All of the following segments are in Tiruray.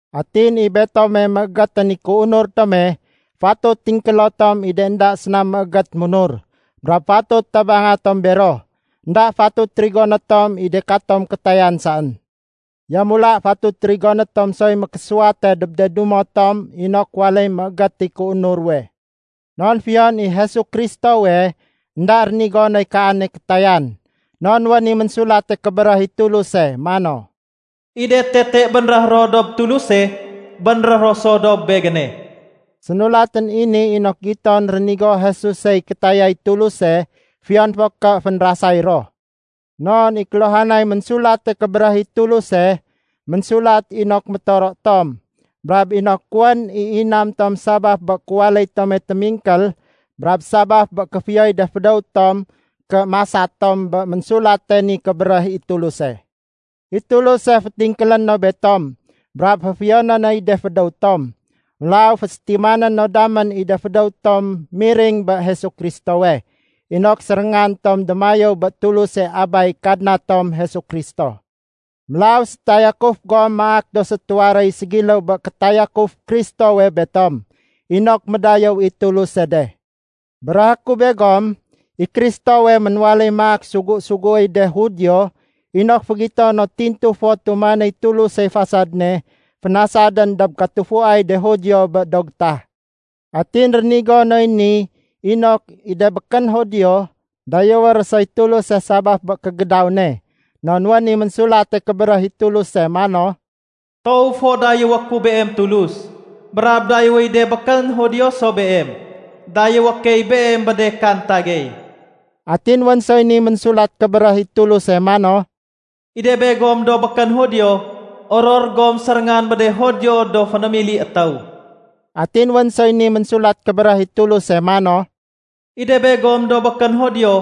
Atin i betome méégétén i kéunur tome, fatut tingkélo tom i de énda séna méégét munur, brab fatut tabanga tom bero. Enda fatut rigoné tom i de katom kétayan saén. Yamula fatut rigoné tom soy mékésuwate dob de dumo tom inok waléy méégét i kéunur ruwe. Non fiyon i Jesu Kristowe énda rénigo noy kaane kétayan. Non wén i Ménsulate Kébéréh i Tuluse mano, “I de tete bénréh ro dob Tuluse, bénréh ro so dob Begéne.” Sénulatén i ni inok giton rénigo Jesusey kétayay Tuluse fiyon fo ké fénrasay ro. Non i kéluhanay Ménsulate Kébéréh i Tuluse, ménsulat inok métoro tom, brab inok wén i inam tom sabaf bé kéwaléy tome témingkél brab sabaf bé kéfiyoy de fédéw tom ké masa tom bé Ménsulate ni Kébéréh i Tuluse. I Tuluse fétingkélé no betom brab féfiyoné noy de fédéw tom. Mélaw fésétimané no damén i de fédéw tom miring bé Jesu Kristowe, inok séréngan tom démayéw bé Tuluse Abay Kadna tom Jesu Kristo. Mélaw sétayakuf gom maak do sétuwaréy ségiléw bé kétayakuf Kristowe betom, inok médayéw i Tuluse de. Béréhé ku begom, i Kristowe ménwaléy maak sugu-suguéy de Judio inok fégito no tintu fo tumanéy Tulusey fasad ne fénasadén dob katufuay de Judio bé do gétah. Atin rénigo noy ni inok i de békén Judio dayéwé ro soy Tuluse sabaf bé kégédaw ne. Non wén i Ménsulate Kébéréh i Tuluse mano, “Toow fo dayéwé ku Beem Tulus, brab dayéwéy de békén Judio so Beem. Dayéwé key Beem bé de kanta gey.” Atin wén soy ni Ménsulat Kébéréh i Tuluse mano, “I de begom do békén Judio, oror gom séréngan bé de Judio do fénémili étéw.” Atin wén soy ni Ménsulat Kébéréh i Tuluse mano, “I de begom do békén Judio,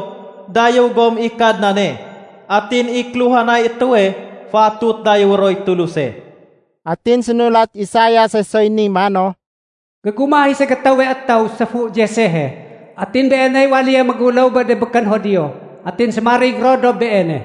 dayéw gom i Kadnane. Atin i kéluhanay étéwe fatut dayéwé roy Tuluse.” Atin sénulat Isaiase soy ni mano, “Gégumah i ségétéwe étéw séfu Jessehe. Atin Beeney waléye méguléw bé de békén Judio. Atin sémarig ro dob Beene.”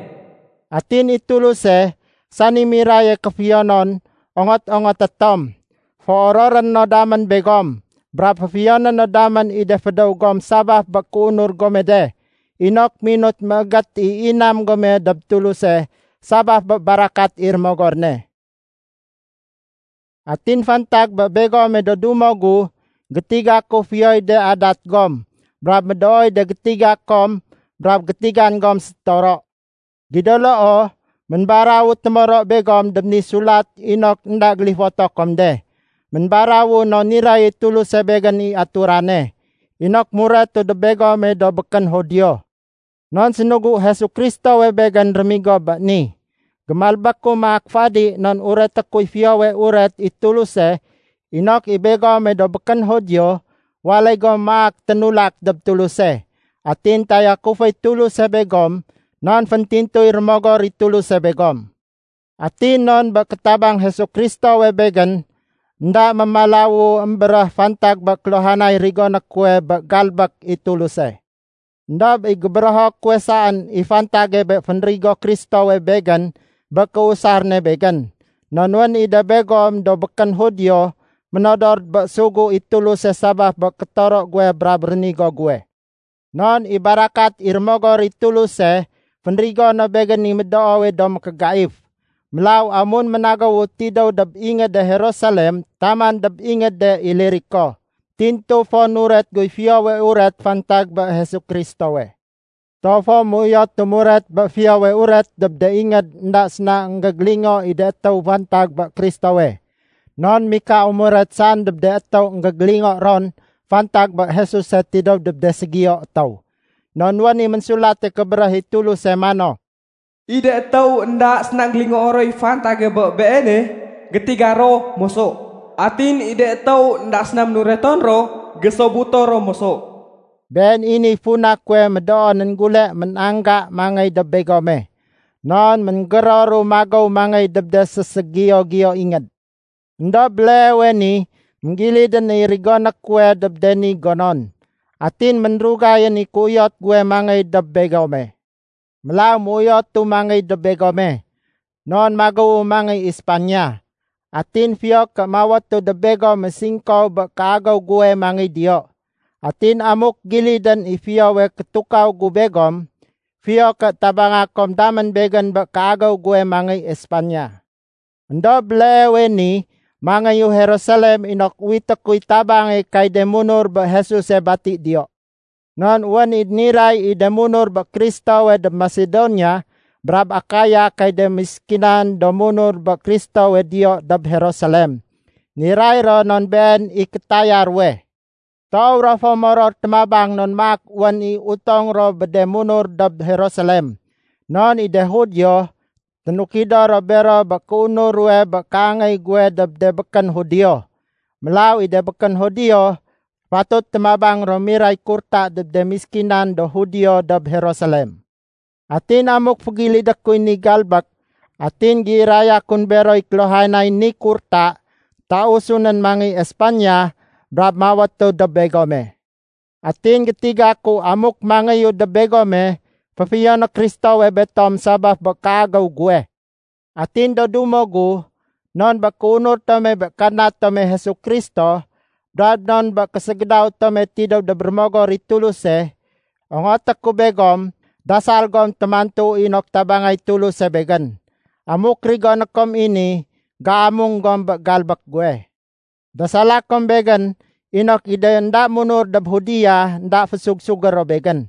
Atin i Tuluse, sani miraye kéfiyonon ongot-ongoté tom, féororé no damén begom, brab féfiyoné no damén i de fédéw gom sabaf bé kéunur gome de, inok minut méégét i inam gome dob Tuluse sabaf bé barakat i Rémogor ne. Atin fantag bé begome do dumo gu, gétiga ku fiyoy de adat gom brab médooy de gétiga kom brab gétigan gom sétoro. Gido loo, ménbarawu témoro begom dob ni sulat inok énda gélifoto kom de. Ménbarawu non niray i Tuluse begén i aturane, inok muretu dob begome do békén Judio. Non sénugu Jesu Kristowe begén rémigo bé ni. Gémalbéku maak fadi non ureté kuy Fiyowe Uret i Tuluse inok i begome do békén Judio waléy gom maak ténulak dob Tuluse. Atin tayakuféy Tuluse begom non féntintuy Rémogor i Tuluse begom. Atin non bé kétabang Jesu Kristowe begén, énda mémalawu émbéréh fantag bé kéluhanay rigoné kuwe bé galbék i Tuluse. Endob i gébérého kuwe saén i fantage bé fénrigo Kristowe begén bé kéusar ne begén. Non wén i de begom do békén Judio ménodor bé sugu i Tuluse sabaf bé kétoro guwe brab rénigo guwe. Non i barakat i Rémogor i Tuluse fénrigo no begén i médoowe do mékégaif. Mélaw amun ménagéwu tidéw dob ingéde Jerusalem taman dob ingéde Iliriko, tintu fo nuret guy Fiyowe Uret fantag bé Jesu Kristowe. Toow fo méuyotu muret bé Fiyowe Uret dob de ingéd énda séna énggégélingo i de étéw fantag bé Kristowe. Non mikau muret saén dob de étéw énggégélingo ron fantag bé Jesuse tidéw dob de ségiyo étéw. Non wén i Ménsulate Kébéréh i Tuluse mano, “I de étéw énda séna énggélingoo roy fantage bé Beene, gétiga ro moso. Atin i de étéw énda séna ménureton ro, gésobuto ro moso.” Been i niy funa kuwe médoonén gule ménangga mangéy dob begome. Non ménggéroru magéw mangéy dob de séségiyo-giyo ingéd. Endob béleewe ni, énggilidén i rigoné kuwe dob de ni gonon. Atin ménrugayén i kéuyot guwe mangéy dob begome. Mélaw méuyotu mangéy dob begome. Non magéwu mangéy Espaniya, atin fiyo ké mawétu dob begome singkow bé kéagéw guwe mangéy diyo. Atin amuk gilidén i fiyowe kétukaw gu begom, fiyo ké tabanga kom damén begén bé kéagéw guwe mangéy Espaniya. Endob béleewe ni mangéyu Jerusalem inok uwité kuy tabange kay de munur bé Jesuse bati diyo. Non wén i niray i de munur bé Kristowe dob Masedonia brab Akaya kay de méskinan do munur bé Kristowe diyo dob Jerusalem. Niray ro non been i kétaya ruwe. Toow ro fo moror témabang non maak wén i utong ro bé de munur dob Jerusalem. Non i de Judio ténukido ro bero bé kéunur ruwe bé kéangéy guwe dob de békén Judio. Mélaw i de békén Judio, fatut témabang ro miray kurta dob de méskinan do Judio dob Jerusalem. Atin amuk fégilidé kuy ni galbék atin géiraya kun beroy kéluhanay ni kurta, tausu nén mangéy Espaniya brab mawétu dob begome. Atin gétiga ku amuk mangéyu dob begome, féfiyoné Kristowe betom sabaf bé kéagéw guwe. Atin do dumo gu, non bé kéunur tome bé Kadna tome Jesu Kristo brab non bé késégédaw tome tidéw dob Rémogor i Tuluse, ongoté ku begom dasal gom témantu inok tabangay Tuluse begén. Amuk rigoné kom i ni, géamung gom bé galbék guwe. Dasala kom begén inok i de énda munur dob Judea énda fésug-sugé ro begén.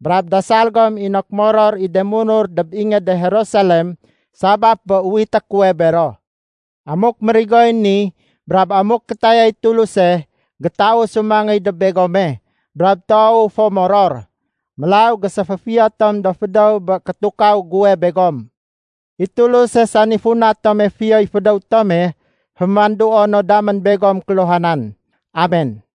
Brab dasal gom inok moror i de munur dob ingéde Jerusalem sabaf bé uwité kuwe bero. Amuk mérigoy ni brab amuk kétayay Tuluse, gétausu mangéy dob begome, brab toowu fo moror. Mélaw géséféfiyo tom do fédéw bé kétukaw guwe begom. I Tuluse, sani funa tome fiyoy fédéw tome, fémanduo no damén begom kéluhanan. Amen.